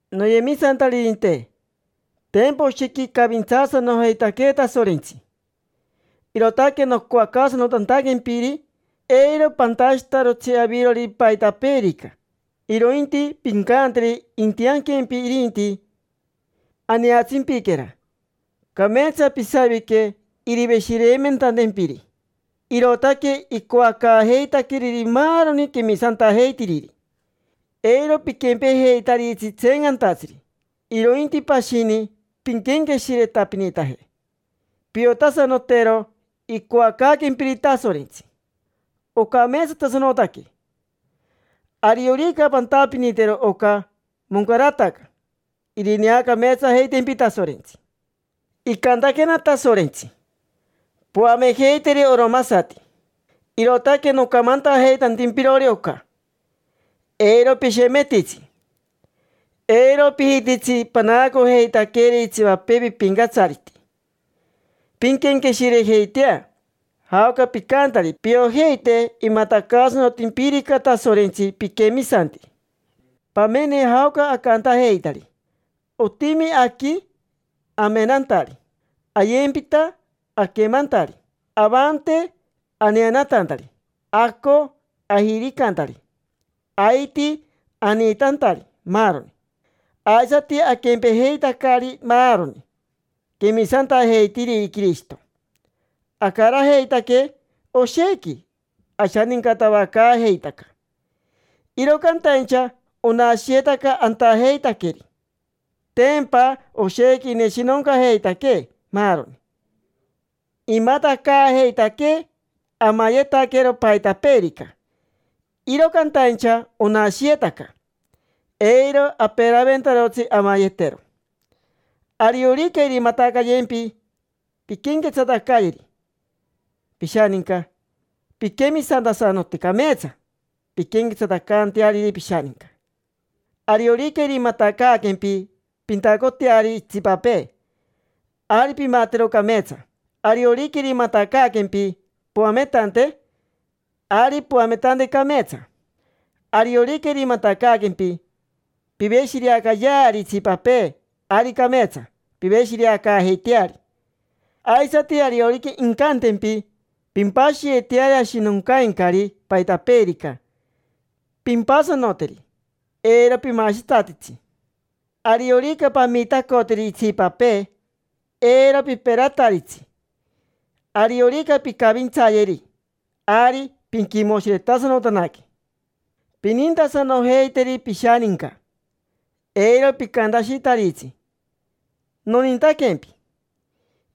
Noyemisantaririnte, tempa oshequi icavintsaasanojeitaquee Tasorentsi. Irootaque nocoacaasanotantaquempiri eiro pantashitarotsi avirori paitapeerica, irointi pincanteri intianquempi irinti. Aneatsimpiquera, cameetsa pisavique iriveshireimentantempiri: irootaque icoacaajeitaqueriri maaroni quemisantajeitiriri. Eiro piquempejeitaritsi tseencantatsiri, irointi pashini pinquenqueshiretapinitaje. Piotasanotero icoacaaquempiri Tasorentsi: ocameetsatasanotaque. Ariorica pantapinitero oca, moncarataca: irineacameetsajeitempi Tasorentsi. Icantaquena Tasorentsi: “Poamejeiteri oromasati”, irootaque nocamantajeitantimpirori oca. Eiro pishemetitsi, eiro pijititsi panaacojeitaqueri itsipapee pipincatsariti. Pinquenqueshirejeitea jaoca picantari, piojeite imatacaasanotimpirica Tasorentsi piquemisantiri. Pamene jaoca acantajeitari: otimi aqui amenantari, ayempita aquemantari, avante aneanatantari, aco ajiricantari, aiti aniitantari, maaroni. Aisati aquempejeitacari maaroni quemisantajeitiriri Quirishito: acarajeitaque oshequi, ashanincatavacaajeitaca. Iro cantaincha onashiyetaca antajeitaqueri. Tempa oshequi ineshinoncajeitaquee maaroni. Imatacaajeitaquee amayetaquero paitapeerica, iro cantaincha onashiyetaca. Eiro aperaventarotsi amayetero. Ariorica irimatacaaquempi pinquenquetsatacayeri pishaninca, pinquemisantasanote cameetsa pinquenquetsatacanteariri pishaninca. Ariorica irimatacaaquempi pintacoteari itsipapee, ari pimatero cameetsa. Ariorica irimatacaaquempi poametante, ari poametante cameetsa. Ariorica irimatacaaquempi piveshireacaayeari itsipapee, ari cameetsa piveshireacaajeiteari. Aisati ariorica incantempi pimpashiyeteari ashinoncaincari paitapeerica, pimpasanoteri: eiro pimashitsatitsi. Ariorica pamitacoteri itsipapee, eiro piperataritsi. Ariorica pincavintsayeri, ari pinquimoshiretasanotanaque. Pinintasanojeiteri pishaninca, eiro picantashitaritsi: “Nonintaquempi”,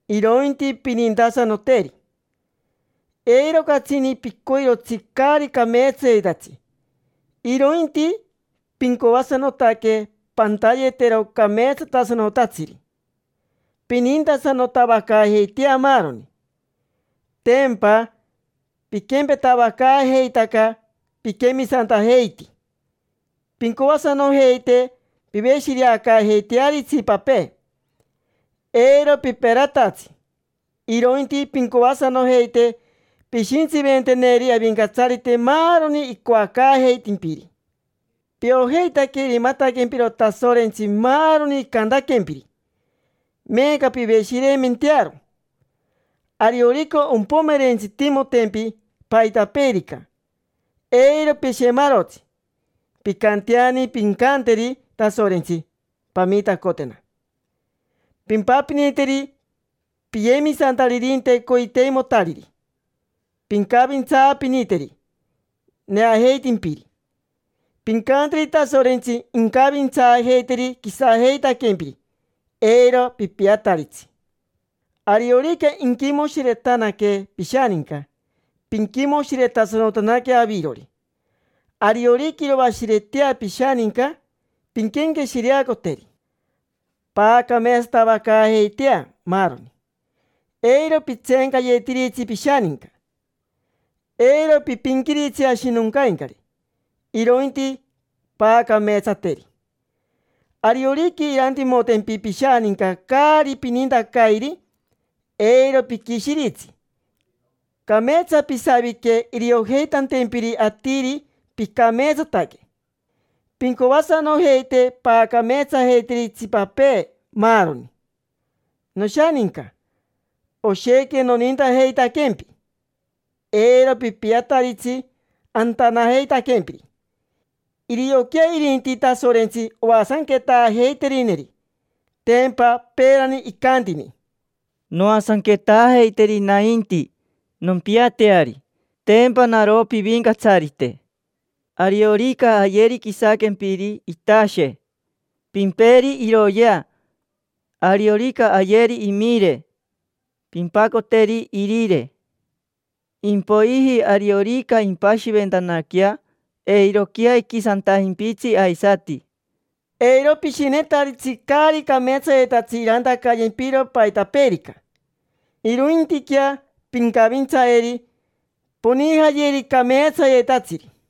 irointi pinintasanoteri. Eiro catsini picoirotsi caari cameetsayetatsi, irointi pincoasanotaque pantayetero cameetsatasanotatsiri. Pinintasanotavacaajeitea maaroni: tempa piquempetavacaajeitaca, piquemisantajeiti. Pincoasanojeite piveshireacaajeiteari itsipapee. Eiro piperatatsi, irointi pincoasanojeite pishintsiventeneri Avincatsarite maaroni incoacaajeitempiri. Piojeitaque irimataquempiro Tasorentsi maaroni icantaquempiri: meeca piveshireimentearo. Ariorica ompomerentsitimotempi paitapeerica, eiro pishemarotsi. Pincanteani pincanteri Tasorentsi: “Pamitacotena”. Pimpapiniteri piyemisantaririnte coiteimotariri. Pincavintsaapiniteri neajeitimpiri. Pincanteri Tasorentsi incavintsaajeiteri quisajeitaquempiri, eiro pipiataritsi. Ariorica inquimoshiretanaque pishaninca, pinquimoshiretasanotanaque avirori. Ariorica iroashiretea pishaninca, pinquenqueshireacoteri. Paacameetsatavacaajeitea, maaroni. Eiro pitseencayetiritsi pishaninca. Eiro pipinquiritsi ashinoncaincari, irointi paacameetsateri. Ariorica irantimotempi pishaninca caari pinintacairi, eiro piquishiritsi. Cameetsa pisavique iriojeitantempiri atiri picameetsataque. Pincoasanojeite paacameetsajeiteri itsipapee, maaroni. Noshaninca, oshequi nonintajeitaquempi. Eiro pipiataritsi antanajeitaquempiri. Irioquea irinti Tasorentsi oasanquetaajeiterineri. Tempa peerani icantini: “Noasanquetaajeiteri nainti, nompiateari. Tempa naro pivincatsarite. Ariorica ayeri quisaquempiri itashe, pimperi iroyea. Ariorica ayeri imire, pimpacoteri irire. Impoiji ariorica impashiventanaquea, eiroquea iquisantajimpitsi aisati”. Eiro pishinetaritsi caari cameetsayetatsi irantacayempiro paitapeerica, irointiquea pincavintsayeri, ponijayeri cameetsayetatsiri.